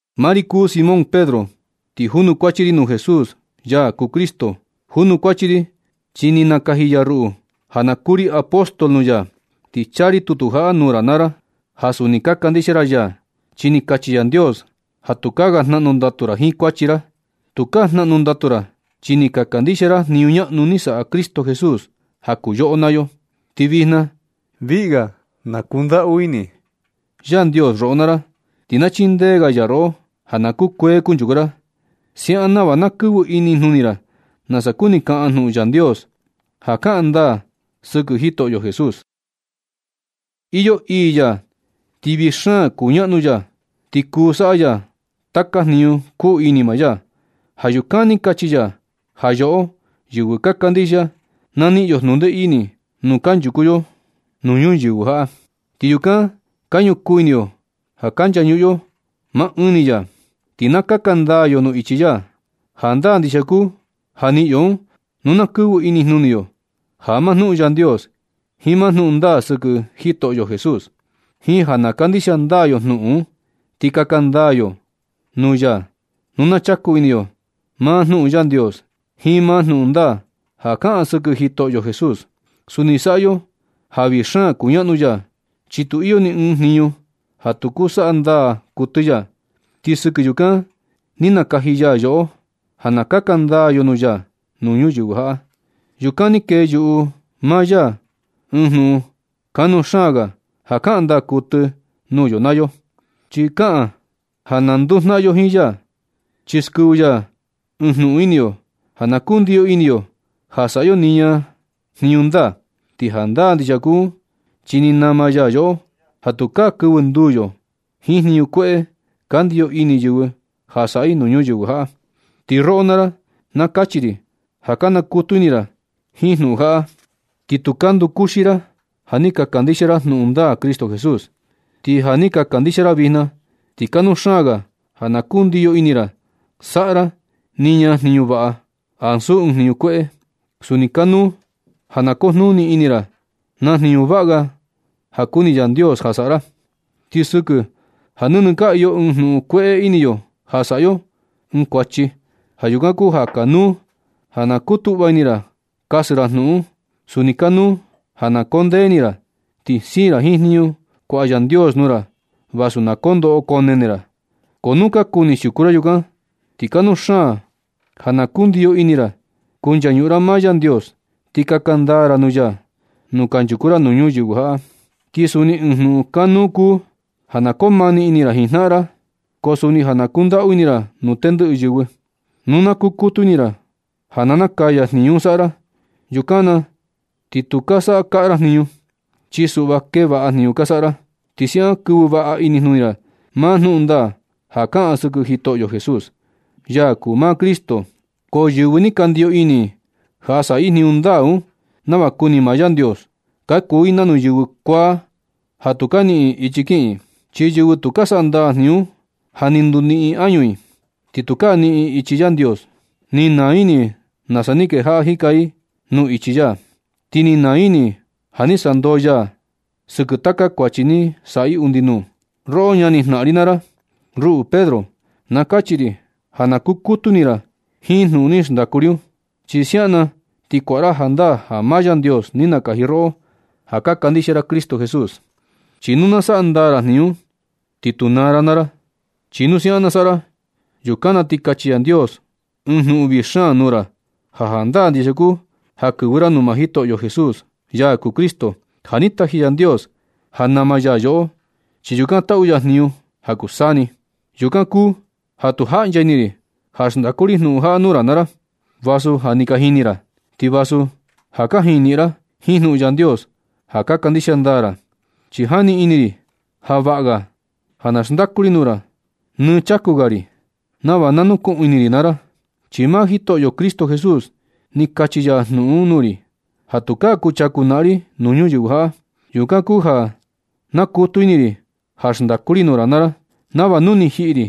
Maa ri kuu Simón Pedro ti junukuachi ri nuu Jesús, ya kuu Cristo. Junukuachi ri chi ni nakaji ya ruꞌu ja na kuu ri apóstol nuu ya. Ti chaa ri tutu jaꞌa nuu ra naa ra, ja suni ka kandixia ra ya, chi ni kachi Yandios ja tukaa ga jnaꞌnu ndatu ra jiin kuachi ra. Tukaa jnaꞌnu ndatu ra, chi ni ka kandixia ra jniñu ñaꞌnu ni saꞌa Cristo Jesús ja kuu yoꞌo naa yo. Ti vijna viꞌi ga na kundaꞌu ini Yandios roꞌo naa ra, ti na chindee ga ya roꞌo ja na kukuee kunchuku ra. Siaꞌan nava na kɨvɨ inijnuni ra nasa kuni kaꞌan jnuꞌun Yandios ja kaꞌan ndaa sɨkɨ Jitoꞌo Jesús. Iyo ii ya ti vii xaan kuñaꞌnu ya, ti kuu saꞌa ya taka jniñu kuu ini maa ya. Ja yukan ni kachi ya ja yoꞌo, yɨvɨ ka kandixia, na niꞌin yo jnundee ini nu kanchuku yo nuu ñuyɨvɨ jaꞌa. Ti yukan ka ñukuu ini yo ja ka nchañuꞌun yo maa ɨɨn ni ya, ti na kaka ndaa yo nuu ichi ya. Jandaa ndixia kuu ja niꞌin yo un nu na kɨvɨ inijnuni yo maa jnuꞌun Yandios jiin maa jnuꞌun ndaa sɨkɨ Jitoꞌo Jesús, jiin ja na kandixia ndaa yo jnuꞌun un. Ti kaka ndaa yo nuu ya nu na chaku ini yo maa jnuꞌun Yandios jiin maa jnuꞌun ndaa ja kaꞌan sɨkɨ Jitoꞌo Jesús. Suni saꞌa yo ja vii xaan kuñaꞌnu ya, chi tu iyo ni ɨɨn jniñu ja tu kuu saꞌa ndaa kuɨtɨ ya. Ti sɨkɨ yukan ni nakaji ya yoꞌo ja na kaka ndaa yo nuu ya nuu ñuyɨvɨ jaꞌa. Yukan ni kee yuꞌu maa ya ɨɨn jnuꞌun kanuu xaan ga ja kaꞌan ndaa kuɨtɨ nuu yo naa yo. Chi kaꞌan ja ka nduu jnaꞌan yo jiin ya, chi skɨvɨ ya ɨɨn jnuꞌun ini yo ja na kundiyo ini yo saꞌa yo niña jniñu ndaa. Ti jandaa ndixia kuu un chi ni nama ya yoꞌo ja tukaa kɨvɨ nduu yo jiin jniñu kueꞌe ka ndiyo ini yɨvɨ ja saꞌa i nuu ñuyɨvɨ jaꞌa. Ti roꞌo naa ra, na kachi ri ja ka nakutu ini ra jiin jnuꞌun jaꞌa, ti tu ka ndukuxi ra. Ja ni ka kandixia ra jnuꞌun ndaa Cristo Jesús. Ti ja ka kandixia ra vijna, ti kanuu xaan ga ja na kundiyo ini ra saꞌa ra niña jniñu vaꞌa, ansu ɨɨn jniñu kueꞌe. Suni kanuu ja na kujnuni ini ra na jniñu vaꞌa ga ja kuni Yandios ja saꞌa ra. Ti sɨkɨ ja nɨnɨ ka iyo ɨɨn jnuꞌun kueꞌe ini yo ja saꞌa yo ɨɨn kuachi, ja yukan kuu ja kanuu ja na kutuꞌva ini ra kasɨ ra jnuꞌun un. Suni kanuu ja na koo ndee ini ra, ti siin ra jiin jniñu kuaꞌa Yandios nuu ra vasu na koo ndoꞌo koo nene ra. Ko nu ka kuni siuku ra jiin yukan, ti kanuu ga xaan ja na kundiyo ini ra kunchañuꞌun ra maa Yandios, ti kaka ndaa ra nuu ya nu kunchuku ra nuu ñuyɨvɨ jaꞌa. Ti suni ɨɨn jnuꞌun kanuu kuu ja na koo mani ini ra jiin jnaꞌan ra. Ko suni ja na kundaꞌu ini ra nuu tendɨꞌɨ yɨvɨ. Nu na nakutu ini ra ja na nakaya jniñu un saꞌa ra, yukan na ti tu ka saꞌa kaꞌa ra jniñu. Chi suꞌva kee vaꞌa jniñu ka saꞌa ra, ti siaꞌan kɨvɨ vaꞌa inijnuni ra maa jnuꞌun ndaa ja kaꞌan sɨkɨ Jitoꞌo Jesús, ya kuu maa Cristo. Ko yɨvɨ tu ka ndiyo ini i ja saꞌa i jniñu ndaa un nava kuni maa Yandios, ka kuu i nanu yɨvɨ kuaa ja tu ka niꞌin i ichi kiꞌin i. Chi yɨvɨ tu saꞌa ndaa jniñu un, ja ni nduniꞌin ini añu i, ti tukaa niꞌin i ichi Yandios. Ni naa ini i nasa ni kejaꞌa jika i nuu ichi ya, ti ni naa ini i ja ni sandoo ya i sɨkɨ taka kuachi ni saꞌa i undi nuu. Roꞌo ñani jnaꞌan ri naa ra, ruꞌu Pedro, na kachi ri ja na kukutu ini ra jiin jnuꞌun ni xndaku ri un. Chi siaꞌan na ti kuaꞌa ra jandaa ja maa Yandios ni nakaji roꞌo ja ka kandixia ra Jitoꞌo Cristo Jesús. Chi nu na saꞌa ndaa ra jniñu un, ti tu naa ra naa ra. Chi nu siaꞌan na saꞌa ra, yukan na ti kachi Yandios ɨɨn jnuꞌun vii xaan nuu ra ja jandaa ndixia kuu ja kɨvɨ ra nuu maa Jitoꞌo Jesús, ya kuu Cristo ja ni taji Yandios ja nama ya yoꞌo, chi yukan taꞌu ya jniñu ja kuu saa ni. Yukan kuu ja tu jaꞌncha ini ri ja xndaku ri jnuꞌun jaꞌa nuu ra naa ra, vasu ja ni ka jini ra un, ti vasu ja kajiin niꞌin ra jiin jnuꞌun Yandios ja ka kandixia ndaa ra. Chi jani ini ri ja vaꞌa ga ja na xndaku ri nuu ra nɨ chaku ga ri, nava na nukuꞌun ini ra naa ra. Chi maa Jitoꞌo Cristo Jesús ni kachi ya jnuꞌun un nuu ri ja tukaa kuchaku naꞌan ri nuu ñuyɨvɨ jaꞌa. Yukan kuu ja nakutu ini ri ja xndaku ri nuu ra naa ra, nava nu ni jiꞌi ri,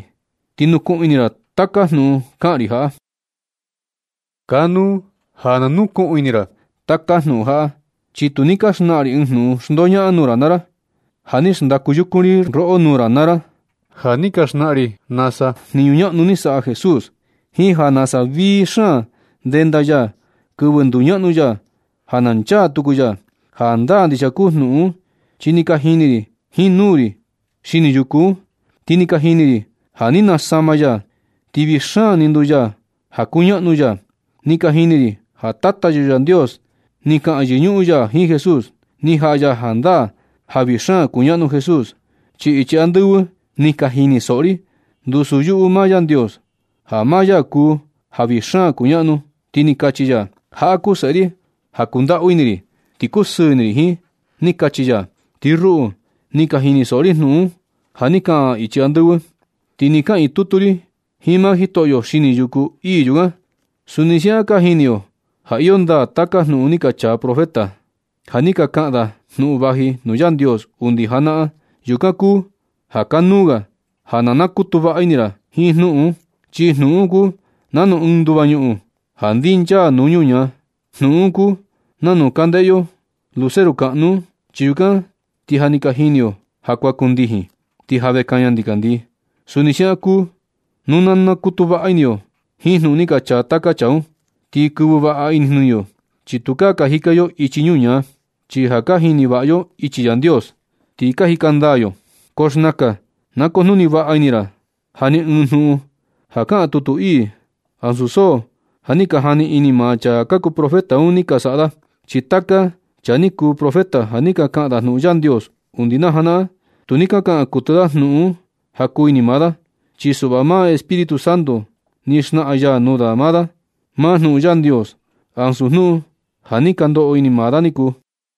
ti nukuꞌun ini ra taka jnuꞌun kaꞌan ri jaꞌa. Kanuu ja na nukuꞌun ini ra taka jnuꞌun jaꞌa, chi tu ni ka xnaꞌan ri ɨɨn jnuꞌun xndoñaꞌan nuu ra naa ra. Ja ni xndaku yukun ri roꞌo nuu ra naa ra na ni ka xnaꞌan ri nasa jniñu ñaꞌnu ni saꞌa Jesús, jiin ja nasa vii xaan ndenda ya kɨvɨ nduñaꞌnu ya ja nchaa tuku ya. Jandaa ndixia kuu jnuꞌun un, chi ni ka jini ri jiin nuu ri xini yuku un. Ni ka jini ri ja ni nasama ya, ti vii xaan ni nduu ya ja kuñaꞌnu ya. Ni ka jini ri ja Tata yo Yandios ni kaꞌan yɨñuꞌun ya jiin Jesús, ni jaꞌa ya jandaa ja vii xaan kuñaꞌnu Jesús. Chi ichi andɨvɨ ni ka jinisoꞌo ri ndusu yuꞌu maa Yandios, ja maa ya kuu ja vii xaan kuñaꞌnu, ti ni kachi ya: “Jaꞌa kuu Seꞌe ri ja kundaꞌu ini ri, ti kusɨɨ ini ri jiin”, ni kachi ya. Ti ruꞌu, ni ka jinisoꞌo ri jnuꞌun un ja ni kaꞌan ichi andɨvɨ, chi ni kaꞌiin tutu ri jiin maa Jitoꞌo xini yuku ii yukan. Suni siaꞌan ka jini yo ja iyo ndaa taka jnuꞌun ni ka chaa taka profeta, ja ni ka kaꞌan da jnuꞌun vaji nuu Yandios undi janaꞌan. Yukan kuu ja kanuu ga ja na nakutu vaꞌa ini ra jiin jnuꞌun un, chi jnuꞌun un kuu nanu ɨɨn nduva ñuꞌun ja ndinchaa nuu ñuñaa. Jnuꞌun un kuu nanu ka ndeꞌe yo luceru kaꞌnu un, chi yukan ti ja ni ka jini yo ja kuan kundijin, ti ja vee kaña ndikandii. Suni siaꞌan kuu nu na nakutu vaꞌa ini yo jiin jnuꞌun ni ka chaa taka chaa un, ti kɨvɨ vaꞌa inijnuni yo, chi tukaa ka jika yo ichi ñuñaa, chi ja ka jini vaꞌa yo ichi Yandios, ti ka jika ndaa yo. Ko xnakan na kujnuni vaꞌa ini ra ja ni ɨɨn jnuꞌun ja kaꞌan tutu ii, ansu so ja ni ka jani ini maa chaa kuu profeta un ni saꞌa da. Chi taka chaa ni kuu profeta ja ni ka kaꞌan da jnuꞌun Yandios undi janaꞌan, tu ni ka kaꞌan kuɨtɨ da jnuꞌun un ja kuu ini maa da. Chi suꞌva maa Espíritu Santo ni xnaꞌan ya nuu da da maa jnuꞌun Yandios, ansu jnuꞌun ja ni ka ndoꞌo ini maa da niku.